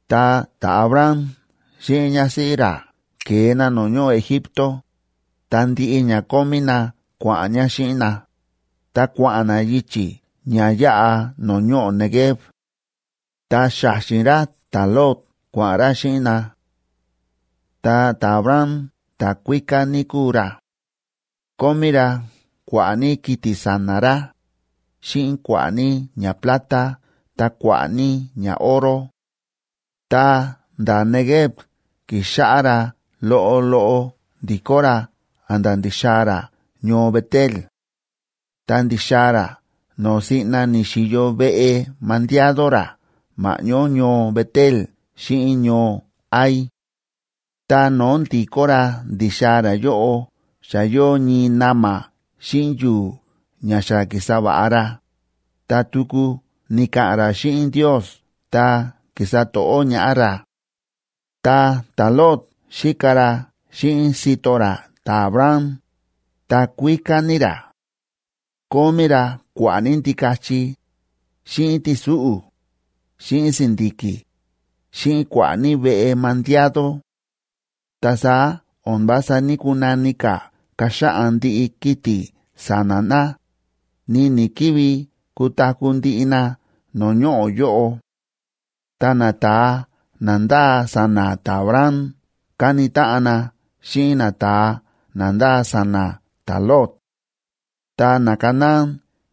Ta ta̱Abram xíꞌin ñásíꞌí ra ke̱e na no̱o̱ ñoꞌo̱ Egipto, ta ndiꞌi ña kómí na kua̱ꞌa̱n ña xíꞌin na, ta kua̱ꞌa̱n na yichi̱ ña yáꞌa no̱o̱ ñoꞌo̱ Neguev. Ta xa̱xi̱n ra ta̱Lot kua̱ꞌa̱n ra xíꞌin na. Ta ta̱Abram ta̱kuíká ní kúu ra. Kómí ra kua̱ꞌa̱ ní kiti̱ sa̱na̱ ra, xíꞌin kua̱ꞌa̱ ní ñaplata ta kua̱ꞌa̱ ní ñaoro. Ta nda̱ Neguev ki̱xáꞌá ra loꞌo loꞌo ndi̱kó ra a̱nda̱ ndi̱xaa̱ ra ñoo Bet‑el. Ta ndi̱xaa̱ ra no̱o̱ siꞌna ni̱xi̱yo veꞌe mandiado ra ma̱ꞌñó ñoo Bet‑el xíꞌin ñoo Hai. Ta no̱o̱ ndi̱kó ra ndi̱xaa̱ ra yóꞌo xa yóo ñii na̱ma̱ xíꞌin yu̱u̱ ña xa ki̱sa va̱ꞌa ra, ta tuku ni̱ka̱ꞌa̱n ra xíꞌin Ndiosa ta ki̱sa to̱ꞌó ñaꞌá ra. Ta ta̱Lot xíka ra xíꞌin sito ra ta̱Abram, ta kuíká ní ra. Kómí ra kua̱ꞌa̱ ní ndikachi, xíꞌin ti̱súꞌu̱, xíꞌin si̱ndi̱ki̱, xíꞌin kua̱ꞌa̱ ní veꞌe mandiado. Ta saá o̱n vása ní‑kunani ka̱ kaxaꞌan ndiꞌi kiti̱ sa̱na̱ na, ni ni̱‑kivi kutaku̱ ndiꞌi na no̱o̱ ñoꞌo̱ yóꞌo. Ta nata̱a na ndáa sa̱na̱ ta̱Abram káni táꞌan na xíꞌin nata̱a na ndáa sa̱na̱ ta̱Lot. Ta naCanaán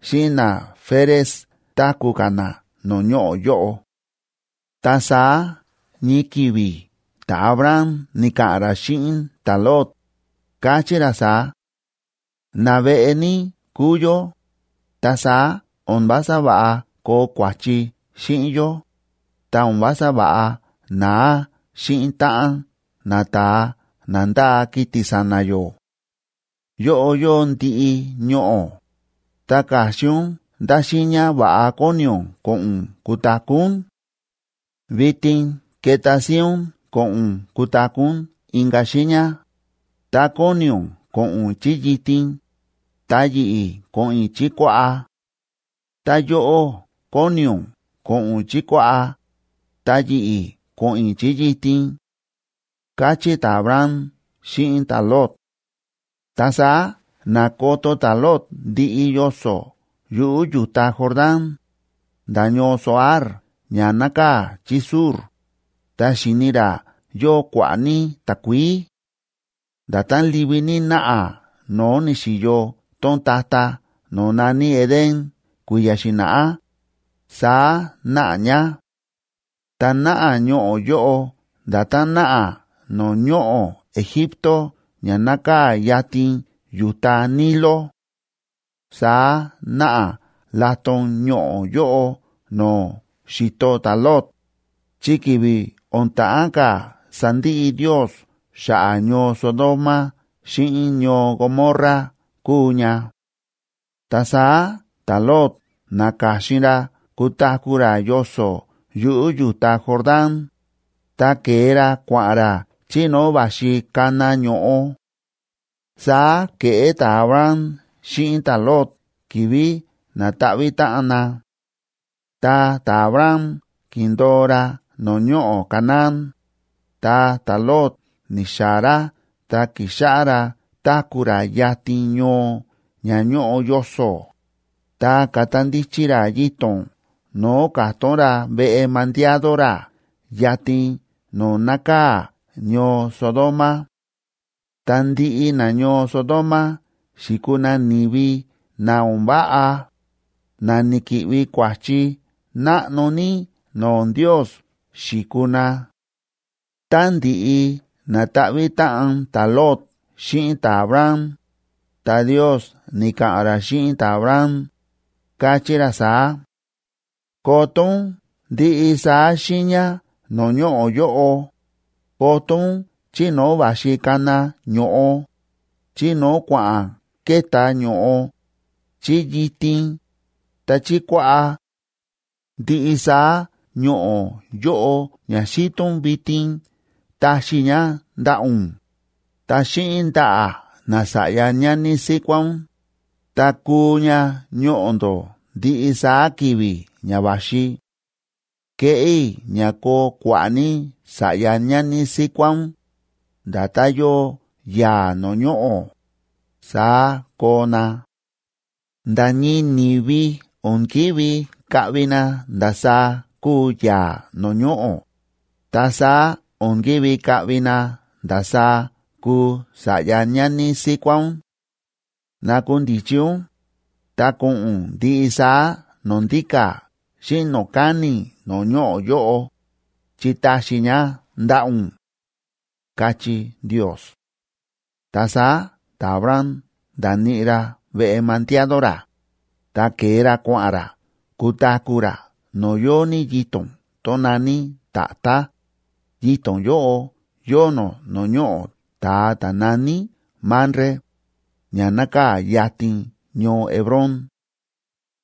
xíꞌin naFerez táku̱ ka̱ na no̱o̱ ñoꞌo̱ yóꞌo. Ta saá ñii ki̱vi̱ ta̱Abram ni̱ka̱ꞌa̱n ra xíꞌin ta̱Lot, káchí ra saá: ―Naveꞌe ní kúu yó, ta saá o̱n vása va̱ꞌa koo kua̱chi xíꞌin yó, ta o̱n vása va̱ꞌa naa xíꞌin táꞌan nata̱a na ndáa kiti̱ sa̱na̱ yó. Yóꞌo yóo ndiꞌi ñoꞌo̱, ta ka̱xin ún ndá xiiña va̱ꞌa kóni ún ko̱ꞌo̱n ún kutaku̱ ún. Vitin keta síín ún ko̱ꞌo̱n ún kutaku̱ ún inka̱ xiiña. Tá kóni ún ko̱ꞌo̱n ún chí yitin, ta yi̱ꞌi̱ ko̱ꞌo̱n i̱ chí kuaꞌá; tá yóꞌó kóni ún ko̱ꞌo̱n ún chí kuaꞌá, ta yi̱ꞌi̱ ko̱ꞌo̱n i̱ chí yitin ―káchí ta̱Abram xíꞌin ta̱Lot. Ta saá na̱koto ta̱Lot ndiꞌi yoso̱ yuꞌu̱ yu̱ta Jordán, nda̱ ñoo Zoar ña nákaa̱ chí sur, ta xi̱ni ra yóo kua̱ꞌa̱ ní takuií. Nda̱tán livi ní náꞌa no̱o̱ ni̱xi̱yo tón ta̱ta̱ no̱o̱ na̱ní Edén kui̱ya̱ xi̱na̱ꞌá, saá náꞌa ña. Ta náꞌa ñoꞌo̱ yóꞌo nda̱tán náꞌa no̱o̱ ñoꞌo̱ Egipto ña nákaa̱ yatin yu̱ta Nilo. Saá náꞌa laton ñoꞌo̱ yóꞌo no̱o̱ xi̱to ta̱Lot, chi ki̱vi̱ o̱n ta̱ꞌán ka̱ sandiꞌi Ndios xa̱ꞌa̱ ñoo Sodoma xíꞌin ñoo Gomorra kúu ña. Ta saá ta̱Lot na̱ka̱xin ra kutaku̱ ra yoso̱ yuꞌu̱ yu̱ta Jordán, ta ke̱e ra kua̱ꞌa̱n ra chí no̱o̱ va̱xi kana ño̱ꞌo. Saá ke̱ꞌé ta̱Abram xíꞌin ta̱Lot ki̱vi̱ na̱ta̱ꞌvi̱ táꞌan na. Ta ta̱Abram ki̱ndo̱o ra no̱o̱ ñoꞌo̱ Canaán, ta ta̱Lot ni̱xaa̱ ra ta ki̱xáꞌá ra táku̱ ra yatin ñoo ña ñóꞌo yoso̱, ta ka̱ta ndichi ra yito̱n no̱o̱ ka̱tón ra veꞌe mandiado ra yatin no̱o̱ nákaa̱ ñoo Sodoma. Ta ndiꞌi nañoo Sodoma xi̱kuu na ni̱vi na o̱n váꞌa, na ni̱ki̱ꞌvi kua̱chi náꞌno ní no̱o̱ Ndios xi̱kuu na. Tá ndi̱ꞌi na̱ta̱ꞌvi̱ táꞌan ta̱Lot xíꞌin ta̱Abram, ta Ndios ni̱ka̱ꞌa̱n ra xíꞌin ta̱Abram, káchí ra saá: Koto ún ndiꞌi saá xiiña no̱o̱ ñoꞌo̱ yóꞌo, koto ún chí no̱o̱ va̱xi kana ño̱ꞌo, chí no̱o̱ kua̱ꞌa̱n ke̱tá ño̱ꞌo, chí yitin, ta chí kuaꞌá. Ndiꞌi saá ñoꞌo̱ yóꞌo ña xíto ún vitin taxi i̱ ña ndaꞌa̱ ún, ta xíꞌin ndaꞌa̱ nasa̱ꞌya ñani síkuá ún, ta kuu ña ñoꞌo̱ ndó ndiꞌi saá ki̱vi̱ ña va̱xi. Keꞌé i̱ ña koo kua̱ꞌa̱ ní sa̱ꞌya ñani síkuá ún, nda̱tán yóo yaa̱ no̱o̱ ñoꞌo̱, saá koo na. Nda̱ ñii ni̱vi o̱n ki̱ví kaꞌvi na ndasaá kúu yaa̱ no̱o̱ ñoꞌo̱, ta saá o̱n kívi kaꞌvi na ndasaá kuu sa̱ꞌya ñani síkuá ún. Nakundichi ún ta ko̱ꞌo̱n ún ndiꞌi saá no̱o̱ ndíka̱ xíꞌin no̱o̱ káni̱ no̱o̱ ñoꞌo̱ yóꞌo, chi taxi i̱ ña ndaꞌa̱ ún, káchí Ndios. Ta saá ta̱Abram nda̱níꞌi ra veꞌe mandiado ra, ta ke̱e ra kua̱ꞌa̱n ra kutaku̱ ra no̱o̱ yóo ní yito̱n tón na̱ní tatá, yito̱n yóꞌo yóo nó no̱o̱ ñoꞌo̱ ta̱a ta̱ na̱ní Mamre, ña nákaa̱ yatin ñoo Hebrón.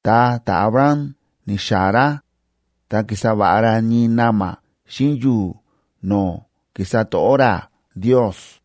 Ta ta̱Abram ni̱xaa̱ ra, ta ki̱sa va̱ꞌa ra ñii na̱ma̱ xíꞌin yu̱u̱ no̱o̱ ki̱sa to̱ꞌó ra Ndios.